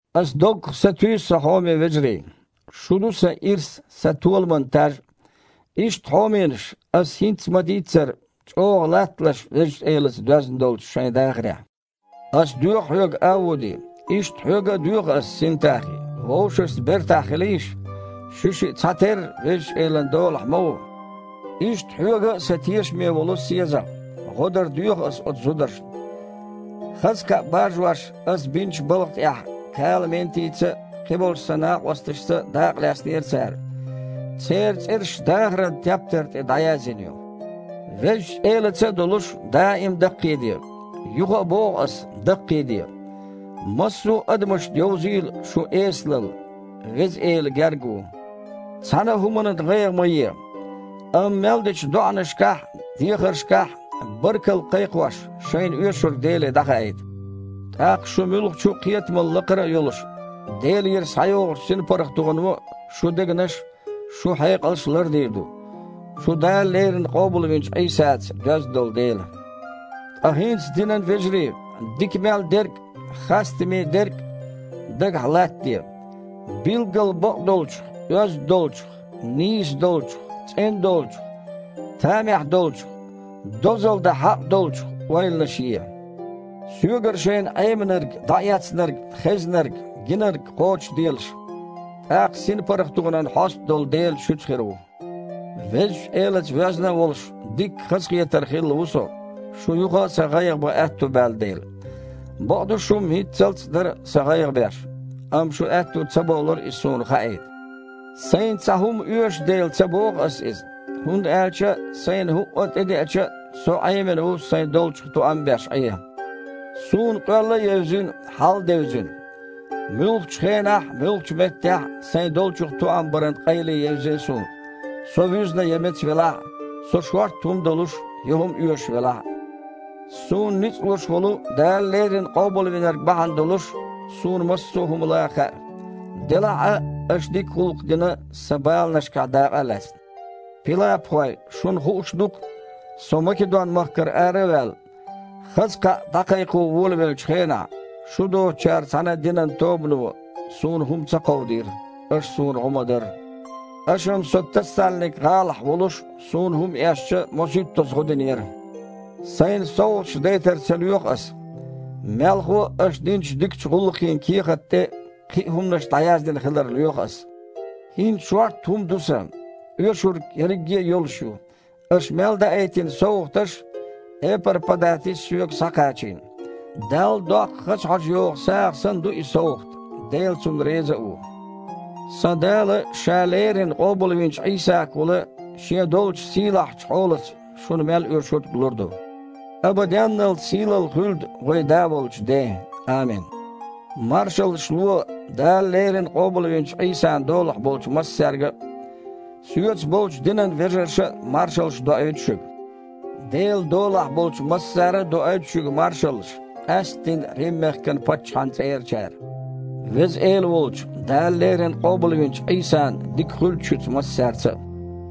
Аса доггах сатуьйсу, сан хьоме вежарий! Шу ду сан ирс а, сан толаман таж а. Иштта, хьоменаш, аса хІинцца ма-дийццара, чІогІа латталаш Везачу Элаца доьзна долчу шайн дахарехь. Аса доьху хьоьга, Авуди, иштта хьоьга а доьху ас, Синтахи, вовшашца бертахь хилийша. Шуьшиъ цхьатерра Везачу Элан долахь ма ву! Иштта хьоьга а, сан тешаме волу СезагІ, гІо дар доьху аса оцу зударшна. Хаза кхаъ баржош, аса бинчу балха тІехь Кала-Ментица а, кхиболчу сан накъосташца а дакъалаьцнера цара. Церан цІераш дахаран тептар тІе дІаязйина ю. Везачу Элаца а долуш, даим а даккхийде. Юха а боху аса: даккхийде! Массо а адамашна йовзийла шун эсалалла. Веза Эла гергга ву. Цхьана а хІуманан гІайгІа ма е, амма мел дечу доІанашкахь а, дехаршкахь а, баркалла а кхайкхош, шайна оьшург Деле дІахаийта. ТІаккха, шун муьлххачу а кхетамал лакхара а йолуш, Делера схьайогІучу синпаргІатоно шун дегнаш а, шун хьекъалш а лардийр ду, шу Дала леррина къобалвинчу Іийсаца доьзна долу дела. Ткъа хІинца, динан вежарий, дика мел дерг а, хастаме дерг а дагахь латтаде. Билггал бакъдолчух, оьзда долчух, нийса долчух, цІена долчух, тамехь долчух, дозалла дан хьакъ долчух ойланаш е. Соьгара шайна Іеминарг, дІаэцнарг, хезнарг, гинарг кхочушделаш. ТІаккха синпаргІатонан хьоста долу Дела шуьца хир ву. Везачу Элаца воьзна а волуш, дикка хазахетар хилла ву со, шун юха а сан гІайгІа бан аьтто баьлла дела. Бакъду, шу-м хІинццалц а дара сан гІайгІа беш, амма шун аьтто ца болура иза суна хаийта. Сайна цхьа хІума оьшу дела, ца боху аса иза. ХІунда аьлча сайна хІуъа а тІедеача а, со Іемина ву сайн долчух тоам а беш Іен. Суна къоьлла а евзина, хьал а девзина. Муьлххачу хенахь а, муьлххачу меттехь а сайн долчух тоам баран къайле евзина суна – со вуьзна я меца велахь а, со шортта хІума долуш я хІума оьшуш велахь а. Суна ницкъ луш волу Дала леррина Къобалвинарг бахьана долуш, суна массо а хІума лан хаьа. Делахь а аша дика гІуллакх дина, сан баланашкахь дакъа а лаьцна. Пилапхой, шуна хууш ду-кх, со Македон-махкара ара а ваьлла, хаза кхаъ дІакхайкхо волавеллачу хенахь, шу доцучара цхьана а динан тобано суна хІума ца кховдийра, аша суна гІо ма-дарра. Аша-м со Тассалник-гІалахь волуш а, суна хІума эшча, мосуьйттазза гІо динера. Сайна совгІаташ дайтар ца лоьху аса. Мелхо а аша динчу дикачу гІуллакхийн кехатна тІе кхин а хІуманаш дІаяздина хилар лоьху ас. ХІинца шортта хІума ду сан. Оьшург ерриге а йолуш ю, аша мел даийтина совгІаташ Эпар-Падатис соьга схьакхачийна. Далла доккху хаза хьожа йогІу сагІа санна ду и совгІат, Дела цунна реза а ву. Сан Дала Ша леррина къобалвинчу Іийсагахула Шен долчу сийлахьчу хьолаца шуна мел оьшург лур ду. Абаденналц сийлалла хуьлда вайн Да волчу Ден! Амин. Маршаллаш ло Дала леррина къобалвинчу Іийсан долахь болчу массаьрга а. Соьца болчу динан вежарша а маршаллаш доуьйту шуьга. Делан долахь болчу массара а доуьйту шуьга маршаллаш, къаьсттина Рим-мехкан паччахьан цІерачара. Веза Эла волчу, Дала леррина къобалвинчу Іийсан дика хуьлда шуьца массаьрца а.